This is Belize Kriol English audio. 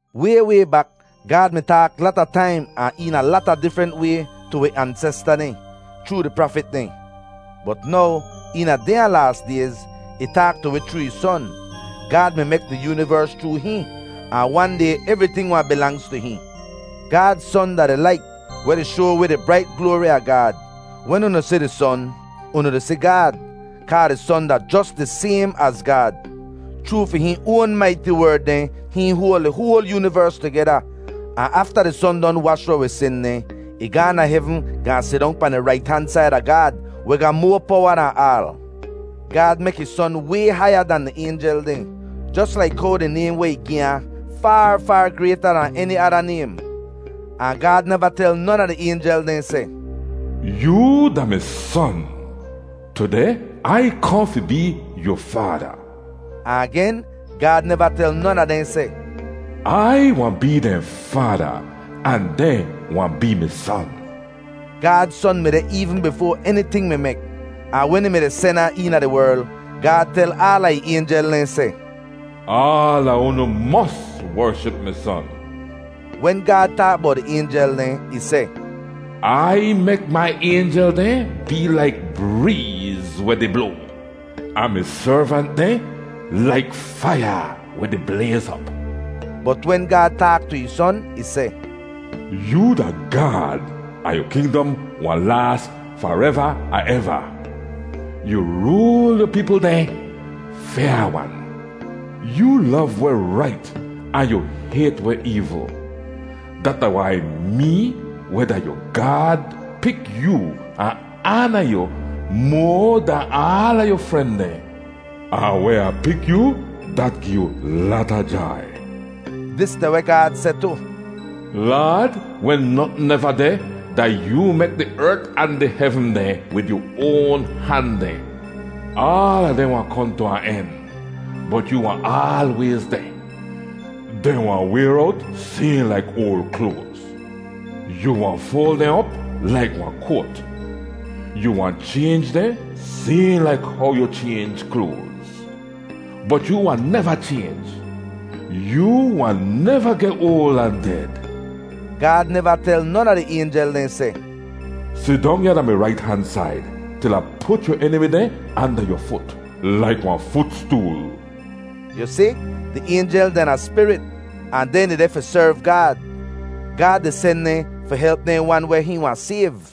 Way way bak, Gaad mi taak lata taim ahn eena lata difrent way tu wi ansesta dehn, chroo di prafit dehn. Bot now eena dehnya laas dayz, ih taak tu wi chroo ih Son. Gaad mi mek di yoonivers chroo hihn, ahn wan day evriting wahn bilangz tu hihn. Gaad Son da di lait weh di shoa wi di brait gloari a Gaad. Wen unu si di Son, unu di si Gaad, kaa di Son da jos di saym az Gaad. Chroo fi hihn oan maiti Werd dehn hihn hoal di hoal yoonivers tugeda. Ahn afta di Son don wash weh wi sin dehn, ih gaahn da hevn gaahn sidong pahn di rait han said a Gaad, weh ga moa powa dahn aal. Gaad mek ih Son way haiya dan di aynjel dehn, jos laik how di naym weh ih gi ahn faar faar grayta dahn eni ada naym. Ahn Gaad neva tel non a di aynjel dehn seh, “Yoo da mi Son; tudeh Ai kohn fi bee yu Faada.” Ahn agen, Gaad neva tel non a dehn seh, “Ai wahn bee dehn Faada, ahn dehn wahn bee mi Son.” Gaad Son mi deh eevn bifoa eniting mi mek, ahn wen ih mi-di sen ahn eena di werl, Gaad tel aala ih aynjel dehn seh, “Aala unu mos wership mi Son.” Wen Gaad taak bowt di aynjel dehn, ih seh, “Ai mek mai aynjel dehn bee laik breez weh di bloa, ahn mi servant dehn laik faiya weh di blayz op.” Bot wen Gaad taak tu ih Son, ih seh, “Yoo da Gaad, ahn yu kingdom wahn laas fareva ahn eva! Yu rool yu peepl dehn fyaa-wan. Yoo lov weh rait ahn yu hayt weh eevl. Dat da wai mee, weh da yu Gaad, pik yoo ahn aana yu moa dahn aala yu fren dehn, ahn weh Ah pik yoo, dat gi yu lata jai.” Dis da weh Gaad seh tu: “Laad, wen notn neva deh, da yoo mek di ert ahn di hevn dehn wid yu oan han dehn. Aala dehn wahn kohn tu wahn en, bot yoo wahn aalwayz deh; dehn wahn wayr owt sayhn laik oal kloaz. Yu wahn foal dehn op laik wahn koat. Yu wahn chaynj dehn sayhn laik how yu chaynj kloaz. Bot yoo wahn neva chaynj; yoo wahn neva geh oal ahn ded.” Gaad neva tel non a di aynjel dehn seh, “Sidong ya da mi rait han said til Ah put yu enimi dehn anda yu fut laik wahn futstool.” Yu si, di aynjel dehn da spirit ahn dehn dehdeh fi serv Gaad. Gaad di sen dehn fi help dehn wan weh hihn wahn sayv.